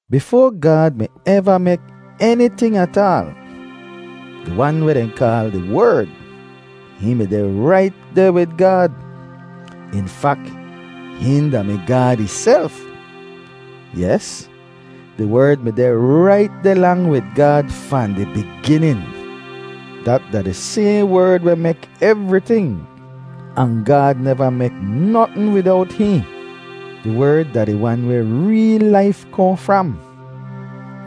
Bifoa Gaad mi eva mek eniting ataal, di Wan weh dehn kaal di Werd, hihn mi deh rait deh wid Gaad. In fak, hihn da-mi Gaad ihself. Yes, di Werd mi deh rait deh lang wid Gaad fahn di biginin. Dat da di sayhn Werd weh mek evriting, ahn Gaad neva mek notn widowt hihn. Di Werd da di Wan weh reel laif kohn fram,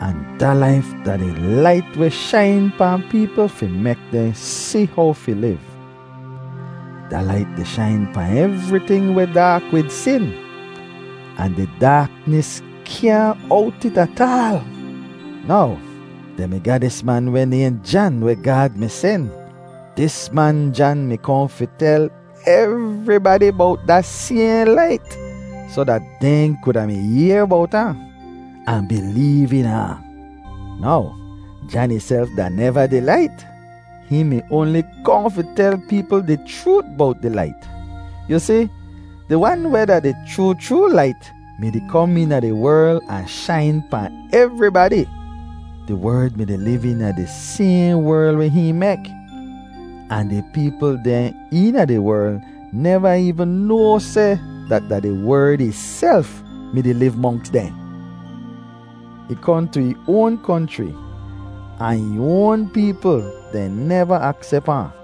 ahn da laif da di Lait weh shain pahn peepl fi mek dehn si how fi liv. Da Lait di shain pahn evriting weh daak wid sin, ahn di daaknis kyaahn owt it ataal. Now, dehn mi ga dis man weh nayhn Jan weh Gaad mi sen. Dis man Jan mi kohn fi tel evribadi bowt da sayhn Lait soh dat dehn kuda mi yehr bowt ahn, ahn bileev eena ahn. Now, Jan ihself da neva di Lait; hihn mi oanli kohn fi tel peepl di chroot bowt di Lait. Yu si, di Wan weh da di chroo chroo Lait mi-di kom eena di werl ahn shain pahn evribadi. Di Werd mi-di liv eena di sayhn werl weh hihn mek, ahn di peepl dehn eena di werl neva eevn noa seh dat da di Werd ihself mi-di liv monks dehn. Ih kohn tu ih oan konchri, ahn ih oan peepl dehn neva aksep ahn.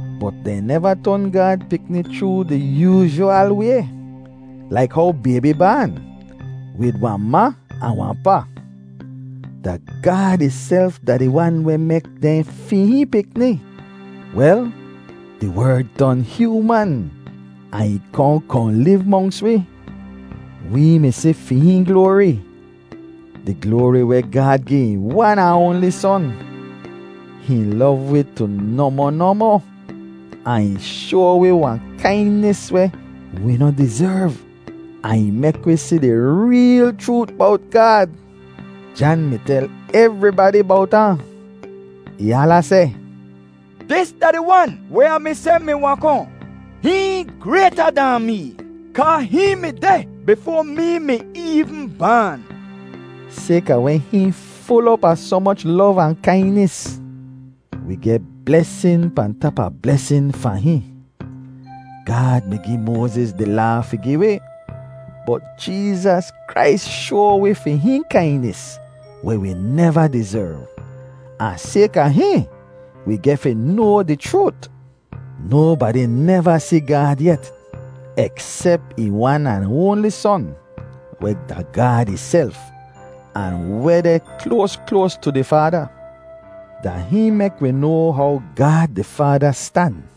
Bot dehn neva ton Gaad pikni chroo di yoozhwal way, laik how baybi baan, wid wahn ma ahn wahn pa. Da Gaad ihself da di Wan weh mek dehn fi hihn pikni. Wel, di Werd ton hyooman ahn ih kohn kohn liv monks wi. Wee mi si fi hihn gloari, di gloari weh Gaad gi ih wan ahn oanli Son. Hihn lov wi tu nohmoh nohmoh ahn ih shoa wi wahn kainis weh wi noh dizerv, ahn ih mek wi si di reel chroot bowt Gaad. Jan mi tel evribadi bowt ahn. Ih hala seh, “Dis da di Wan weh Ah mi seh mi wahn kohn. Hihn grayta dahn mee, kaa hihn mi deh bifoa mee mi eevn baan.” Sayka weh hihn ful op a soh moch lov ahn kainis, wi geh blesin pahn tap a blesin fahn hihn. Gaad mi gi Moaziz di Laa fi gi wi, bot Jeezas Krais shoa wi fi hihn kainis weh wi neva dizerv, ahn sayka hihn, wi geh fi noa di chroot. Nobadi neva si Gaad yet, eksep ih wan ahn oanli Son weh da Gaad ihself, ahn weh deh kloas kloas tu di Faada. Da hihn mek wi noa how Gaad di Faada stan.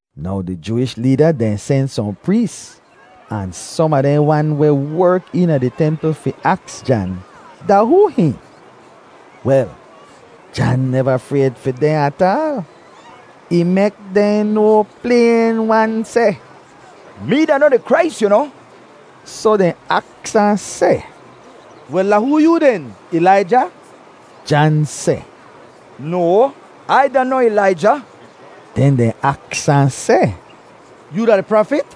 Now di Jooish leeda dehn sen sohn prees ahn som a dehn wan weh werk eena di templ fi aks Jan da hoo hihn. Wel, Jan neva frayd fi dehn ataal; ih mek dehn noa playn-wan seh, “Mee da noh di Krais, yu noh.” Soh dehn aks ahn seh, “Wel, da hoo yoo den? Ilaija?” Jan seh, “No, Ai da noh Ilaija.” Den dehn aks ahn seh, “Yoo da di Prafit?”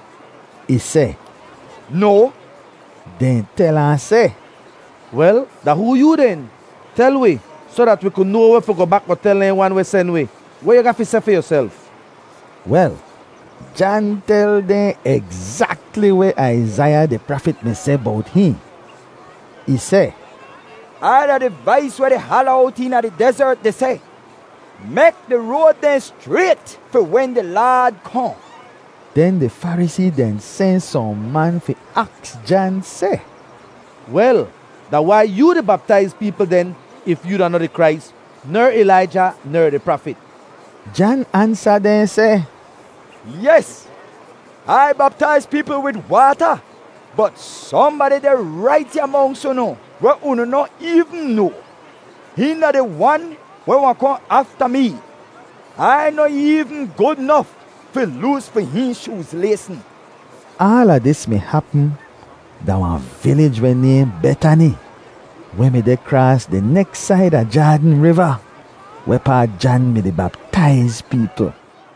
Ih seh, “No.” Dehn tel ahn seh, “Wel, da hoo yoo den? Tel wi soh dat wi ku noa weh fi goh bak goh tel dehn wan weh sen wi. Weh yu ga fi seh fi yuself?” Wel, Jan tel dehn egzakli weh Aizaiya di prafit mi seh bowt hihn. Ih seh, “Ai da di vais weh di hala owt eena di dezert di seh, ‘Mek di road dehn schrayt fi wen di Laad kohn.’” Den di Farisee dehn sen sohn man fi aks Jan seh, “Wel, da wai yoo di baptaiz peepl den if yoo da noh di Krais, ner Ilaija, ner di Prafit?” Jan ansa dehn seh, “Yes, Ai baptaiz peepl wid waata, bot sohnbadi deh rait ya monks unu weh unu noh eevn noa. Hihn da di Wan weh wahn kohn afta mee; Ai noh eevn gud nof fi loos fi hihn shooz laysn.” Aala dis mi hapm da wahn vilij weh nayhn Betani weh mi deh kraas di neks said a Jaadn Riva wehpaa Jan mi-di baptaiz peepl.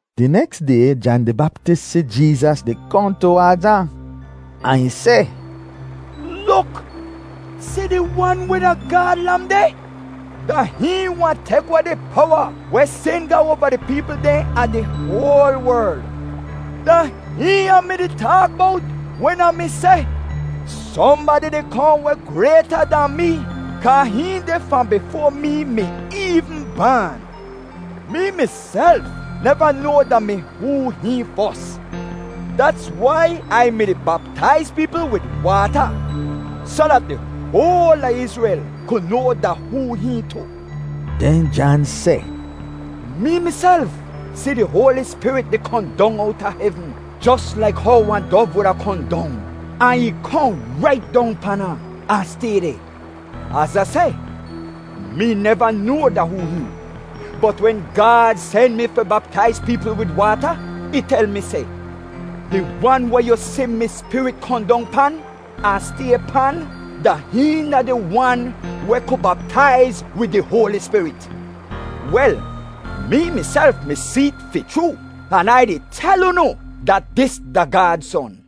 Di neks day Jan di Baptis si Jeezas di kohn tuwaadz ahn, ahn ih seh, “Luk, si di Wan weh da Gaad Lam deh! Da hihn wahn tek weh di powa weh sin ga oava di peepl dehn a di hoal werl. Da hihn Ah mi-di taak bowt wen Ah mi seh, ‘Sohnbadi di kohn weh grayta dahn mee kaa hihn deh fahn bifoa mee mi eevn baan.’ Mee miself neva noa da mi hoo hihn fos. Dats wai Ai mi-di baptaiz peepl wid waata soh dat di hoal a Izrel ku noa da hoo hihn tu.” Den Jan seh, “Mee miself si di Hoali Spirit di kohn dong owta hevn, jos laik how wahn dov wuda kohn dong, ahn ih kohn rait dong pan ahn, ahn stay deh. Az Ah seh, mee neva noa da hoo hihn, bot wen Gaad sen mi fi baptaiz peepl wid waata, ih tel mi seh, ‘Di wan weh yu si mi Spirit kohn dong pan, ahn stay pan, da hihn da di Wan weh ku baptaiz wid di Hoali Spirit.’ Wel, mee miself mi see't fi chroo, an Ai di tel unu dat dis da Gaad Son.”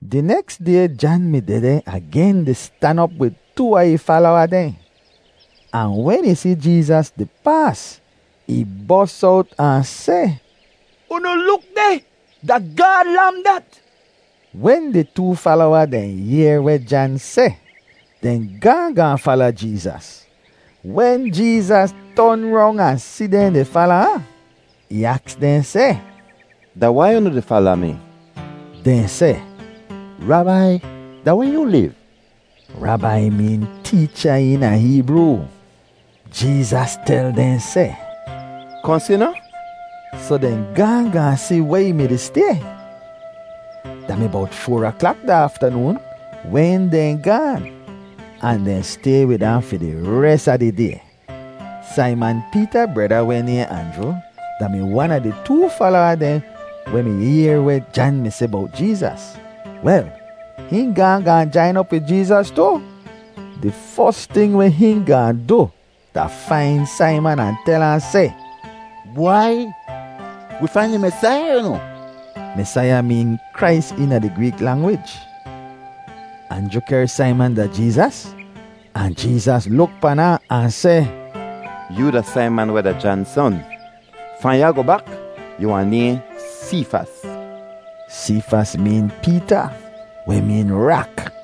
Di neks day Jan mi dehdeh agen di stan op wid too a ih falowa dehn, ahn wen ih si Jeezas di paas, ih bos owt ahn seh, “Unu luk deh! Da Gaad Lam dat!” Wen di too falowa dehn yehr weh Jan seh, dehn gaahn gaahn fala Jeezas. Wen Jeezas ton rong ahn si dehn di fala ahn, ih aks dehn seh, “Da wai unu di fala mi?” Dehn seh, “Rabai, da weh yoo liv?” (Rabai meen teecha eena Heebroo.) Jeezas tel dehn seh, “Kohn si noh?” Soh dehn gaahn gaahn si weh ih mi-di stay. Da mi bowt foar aklak da aftanoon wen dehn gaan, ahn dehn stay wid ahn fi di res a di day. Saiman Peeta breda weh nayhn Anjru da-mi wan a di too falowa dehn weh mi yehr weh Jan mi seh bowt Jeezas. Wel, hihn gaahn gaahn jain op wid Jeezas tu. Di fos ting weh hihn gaahn du da fain Saiman ahn tel ahn seh, “Bwai! Wee fain di Mesaiya, yu noh!” (Mesaiya meen Krais eena di Greek langwij.) Anjru kehr Saiman da Jeezas ahn Jeezas luk pan ahn, ahn seh, “Yoo da Saiman weh da Jan son. Fahn ya goh bak yu wahn nayhn Seefas.” (Seefas meen Peeta, weh meen “rak.”)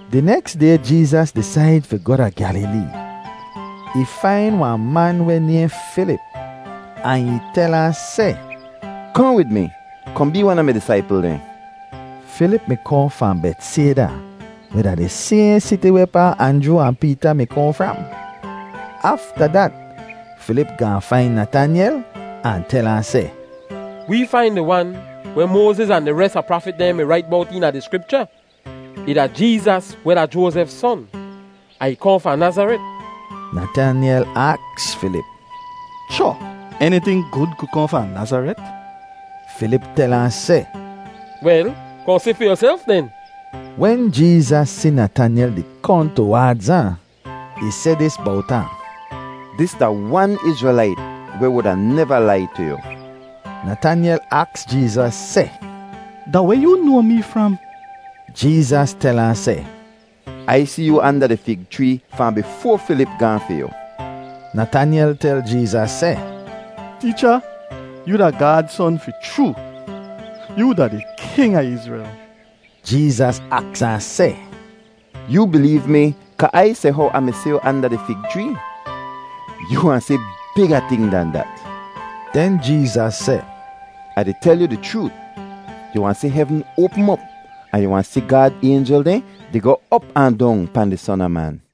Di neks day Jeezas disaid fi goh da Gyalilee. Ih fain wahn man weh nayhn Filip ahn ih tel ahn seh, “Kohn wid mi, kohn bee wan a mi disaipl dehn.” Filip mi kohn fahn Betsayda weh da di sayhn siti wehpaa Anjru ahn Peeta mi kohn fram. Afta dat Filip gaahn fain Natanyel ahn tel ahn seh, “Wee fain di Wan weh Moaziz ahn di res a prafit dehn mi rait bowt eena di Skripcha. Ih da Jeezas weh da Joazef son, ahn ih kohn fahn Nazaret.” Natanyel aks Filip, “Cho! Eniting gud ku kohn fahn Nazaret?” Filip tel ahn seh, “Wel, kohn si fi yuself den.” Wen Jeezas si Natanyel di kohn tuwaadz ahn, ih seh dis bowt ahn, “Dis da wan Izrelait weh wuda neva lai tu yu!” Natanyel aks Jeezas seh, “Da weh yoo noa mee fram?” Jeezas tel ahn seh, “Ai si yoo anda di fig chree fahn bifoa Filip gaahn fi yu.” Natanyel tel Jeezas seh, “Teecha, yoo da Gaad Son fi chroo. Yoo da di king a Izrel.” Jeezas aks ahn seh, “Yoo bileev mi kaa Ai seh how Ah mi si yu anda di fig chree? Yu wahn si biga ting dan dat.” Den Jeezas seh, “Ah di tel yu di chroot, yu wahn si hevn oapm op ahn yu wahn si Gaad aynjel dehn di goh op ahn dong pahn di Son a Man.”